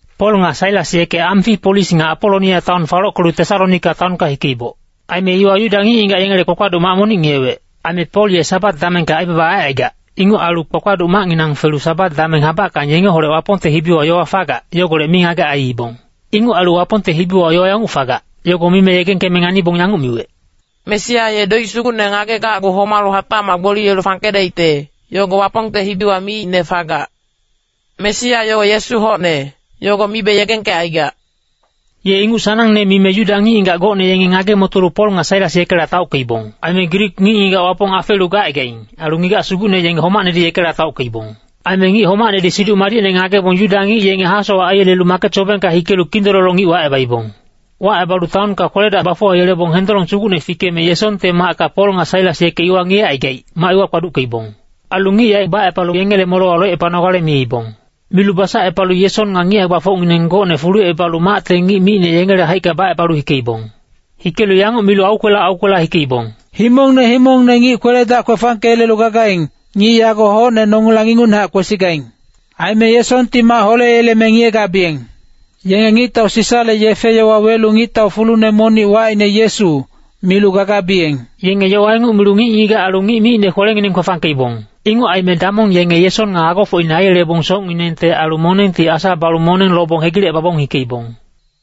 Pol nga Sailas yeke Amfipolis nga Apolonia taon falockelu Tesalonika taonka hikeiboc. Aime iwa Yuda ngic-ngigac yengele kpakpaduc mac monic ngiyewec. Aime Pol ye Sabat damengka aibaba aicaigac, inguc ailu kpakpaduc macnginang felu Sabat dameng habackang yengeholec Wapongte hibiwa yowa fagac, yogolec mingagec aiibong. Inguc ailu Wapongte hibiwa yowa yanguc fagac, yogo mime yegengkeme nganibong yanguc miwec, “Mesia ye doic sugucne ngagegacgu homalu hatacmac gboliyelu fangkedaicte, yogo Wapongte hibiwa miicne fagac. Mesia yogo ye Yesu hocne, yogo mibe yegengkecaigac.” Ye inguc sanangne mime Yuda ngic-ngigac gocne yenge ngage-motolu Pol nga Sailas yekela taockeibong. Aime Grik ngic-ngigac Wapong afeelu gacaigaing, ailu ngigac sugucne yenge homacnedi yekela taockeibong. Aime ngic homacnedi Siduc Madicne ngagebong Yuda ngic yenge hasowac aiyelelu maket sobengka hikelu kindololo ngic wacebaibong. Wacebalu taonka kwele-dac bafuwayelebong hendolong sugucne fikeme Yesonte macka Pol nga Sailas yeke ngiyecaigaic, mac iwa kpaduckeibong. Ailu ngic yaec bacepalu yengele molewa locepanogale miibong. Milu basacepalu Yeson nga ngic hae-gbafocngineng gocne fulucebalu macte ngic micne yengele haicka bacebalu hikeibong. Hikelu yanguc milu aukwela aukwela hikeibong, “Himongne himongne ngic kwele-dac kwefangkeyelelu gagaing, ngic yago hocne nongilang ingucnehac kwesigaing. Aime Yesonti mac holeyeleme ngiyegabiyeng. Yenge Ngictau Sisale yefe-yowa welu ngictau fulune monic wacine Yesu, milu gagabiyeng.” Yenge yowa inguc milu ngic-ngigac ailu ngic micne kwelengineng kwefangkeibong. Inguc aime damong yenge Yeson nga agofocine aiyelebong socnginengte ailu monengti asa balu moneng lobong hegilecebabong hikeibong.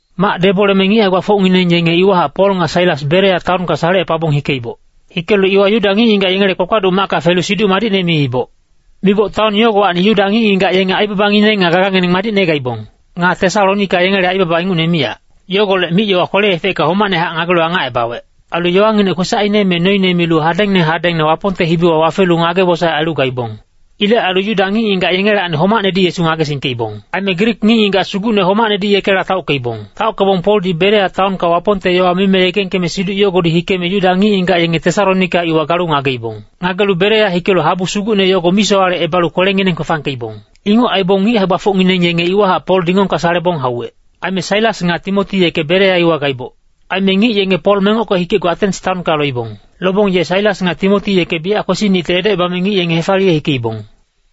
Mac deboleme ngic hae-gbafocngineng yenge iwahac Pol nga Sailas Berea taonka salecepabong hikeiboc. Hikelu iwa Yuda ngic-ngigac yengele kpakpaduc macka felu Siduc Madicne miiboc. Miboc taon yogowacni Yuda ngic-ngigac yenge aibabangineng nga gagangineng madicne gaibong. Nga Tesalonika yengele aibaba ingucne miyac. Yogolec mic-yowa kwele-efecka homacnehac ngagelu angacebawec. Ailu yowanginec kwesacine me noine milu hadengne hadengne Wapongte hibiwa wafelu ngage-wosaec ailu gaibong. Ilec ailu Yuda ngic-ngigac yengelacni homacnedi Yesu ngagesingkeibong. Aime Grik ngic-ngigac sugucne homacnedi yekela taockeibong. Taockebong Poldi Berea taonka Wapongte yowa mime yegengkeme siduc yogodi hikeme Yuda ngic-ngigac yenge Tesalonika iwa galu ngageibong. Ngagelu Berea hikelu habu sugucne yogo misowalecebalu kwelengineng kwefangkeibong. Inguc aibong ngic hae-gbafocngineng yenge iwahac Pol dingongka salebong hauwec. Aime Sailas nga Timoti yeke Berea iwa gaiboc. Aime ngic yenge Pol mengocke hikecgu Atens taonka loibong. Lobong ye Sailas nga Timoti yeke biyac kwesinicte edocebame ngic yenge hefaliye hikeibong.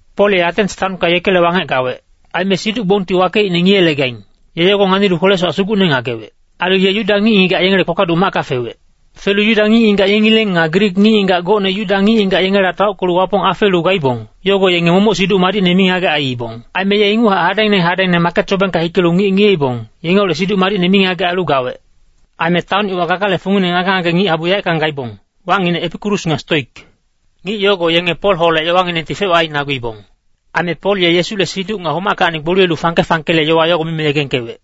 Pol ye Atens taonka yekele wangec gawec. Aime siduc-gbongti wakeicne ngiye-legaing, ye yogo nganilu kwele-sowac sugucne ngagewec. Ailu ye Yuda ngic-ngigac yengele kpakpaduc macka fewec. Felu Yuda ngic-ngigac yengileng nga Grik ngic-ngigac gocne Yuda ngic-ngigac yengela taockelu Wapong afeelu gaibong, yogo yenge momoc Siduc Madicne mingagec aiibong. Aime ye inguchac hadengne hadengne maket sobengka hikelu ngic ngiyeibong, yengeholec Siduc Madicne mingagec ailu gawec. Aime taon iwa gagale fungine ngage-ngage ngic-habu yaeckang gaibong, wacnginec Epikurus nga Stoik. Ngic yogo yenge Polholec yowanginengti fec-wac ainaguibong. Aime Pol ye Yesule siduc nga homackacni gboliyelu fangke-fangkele yowa yogo mime yegengkewec.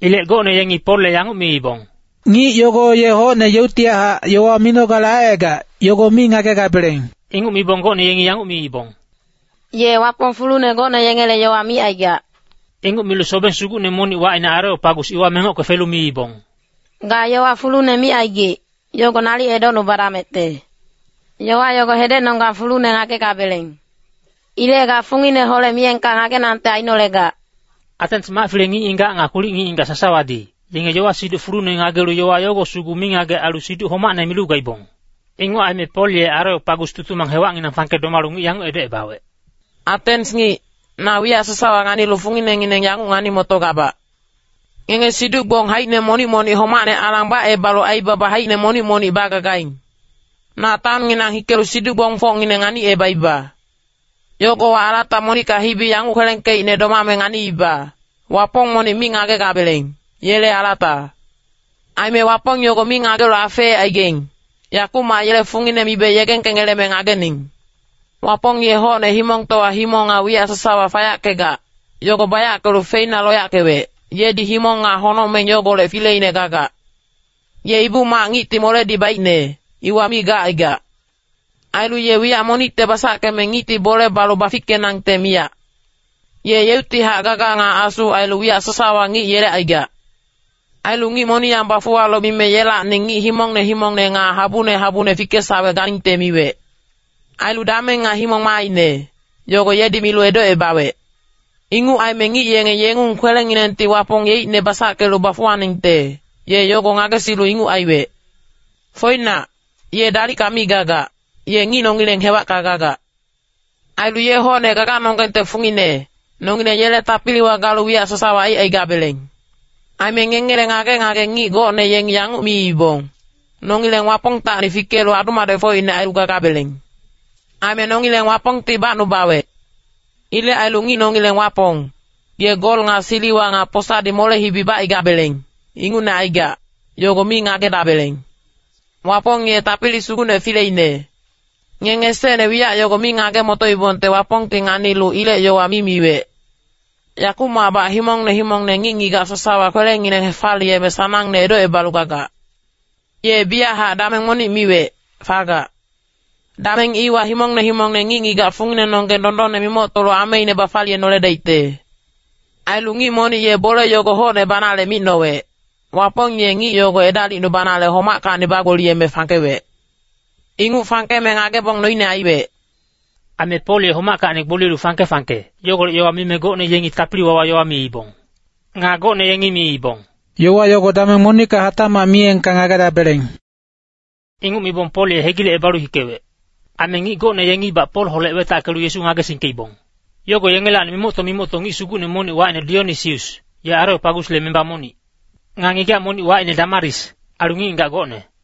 Ilec gocne yengi Polle yanguc miibong, “Ngic yogo ye hocne yeuctihac yowa minogale aicaigac, yogo mi ngagegabeleng.” Inguc mibong gocne yengi yanguc miibong, “Ye wapong fulune gocne yengele yowa micaigac.” Inguc milu sobeng sugucne monic wacine Areopagus iwa mengocke felu miibong, “Ga yowa fulune micaigic, yogo nalic edocnubadamecte. Yowa yogo hedecnonggang fulune ngagegabeleng. Ilec ga fungineholec miyengka ngagenangte ainolegac.” Atens mac-file ngic-ngigac nga kwilic ngic-ngigac sasawadi, yenge yowa-siduc fulune ngagelu yowa yogo sugu mingagec ailu siduc homacne milu gaibong. Inguc aime Pol ye Areopagus tutumang hewacnginang fangke domalu ngic yanguc edocebawec, “Atens ngic, na wiyac sasawa nganilu funginengineng yanguc ngani-motogabac. Ngenge siduc-gbong haicine monic-monic homacne alang bacebalu aibaba haicine monic-monic bagagaing. Na taonnginang hikelu siduc-gbongfocngineng nganicebaiba. Yogowa alata monicka hibi yanguc kwelengkeicne domame nganiiba, ‘Wapong monic mi ngagegabeleng, yele alata.’ Aime wapong yogo mi ngagelu afeecaigaing, yakumac yele fungine mibe yegengkengeleme ngagening. “Wapong ye hocne himongtowa himong nga wiyac sasawa fayackegac, yogo bayackelu feina loyackewec, yedi himong nga honocmeng yogolec fileine gagac. Ye ibu-mac ngicti moledi baicne, iwa mi gacaigac. Ailu ye wiyac monicte basackeme ngicti bole balu bafickenangte miyac. Ye yeuctihac gaga nga asu ailu wiyac sasawa ngic yelecaigac. Ailu ngic moniyang bafuwalu mime yelacni ngic himongne himongne nga habune habune fikesawec ganingte miwec. Ailu dameng nga himong maaine, yogo yedi milu edocebawec. Inguc aime ngic yenge yengung kwelenginengti Wapong yeicne basackelu bafuwaningte, ye yogo ngagesilu inguc aiwec. Foinac, ye dalicka mi gagac, ye ngic nongileng hewacka gagac. Ailu ye hocne gaganonggengte fungine, nongileng yele tapiliwa galu wiyac sasawa aicaigabeleng. Aime ngengele ngage-ngage ngic gocne yengi yanguc miibong, ‘Nongileng Wapongtacni fikelu adu-madecfocine ailu gagabeleng.’ “Aime nongileng Wapongti bacnubawec. Ilec ailu ngic nongileng Wapong, ye gol nga siliwa nga posadi mole-hibi bacaigabeleng, ingucne aigac, yogo mi ngagedabeleng. Wapong ye tapili sugucne fileine. Ngenge esecne wiyac yogo mi ngage-motoibongte Wapongti nganilu ilec yowa mi miwec. Yakumacbac himongne himongne ngic-ngigac sasawa kwelengineng hefaliyenale sanangne edocebalu gagac. Ye biyachac dameng monic miwec, fagac. Dameng iwa himongne himongne ngic-ngigac funginenonggeng dondonne mimoctolu ameine bafaliyenoledaicte. Ailu ngic monic ye bole yogo hocne banale micnowec, Wapong ye ngic yogo edalicnubanale homackacni bagboliyeme fangkewec. Inguc fangkeme ngagebong noine aiwec.” Aime Pol ye homackacni gboliyelu fangke-fangke, yogolec yowa mime gocne yengi tapili-wawa yowa miibong. Nga gocne yengi miibong, “Yowa yogo dameng monicka hatacmac miyengka ngagedabeleng.” Inguc mibong Pol ye hegilecebalu hikewec. Aime ngic gocne yengibac Polholec wetackelu Yesu ngagesingkeibong. Yogo yengelacni mimocto-mimocto ngic sugucne monic wacine Dionisius, ye Areopagusle memba monic. Nga ngigac monic wacine Damaris, ailu ngic-ngigac gocne.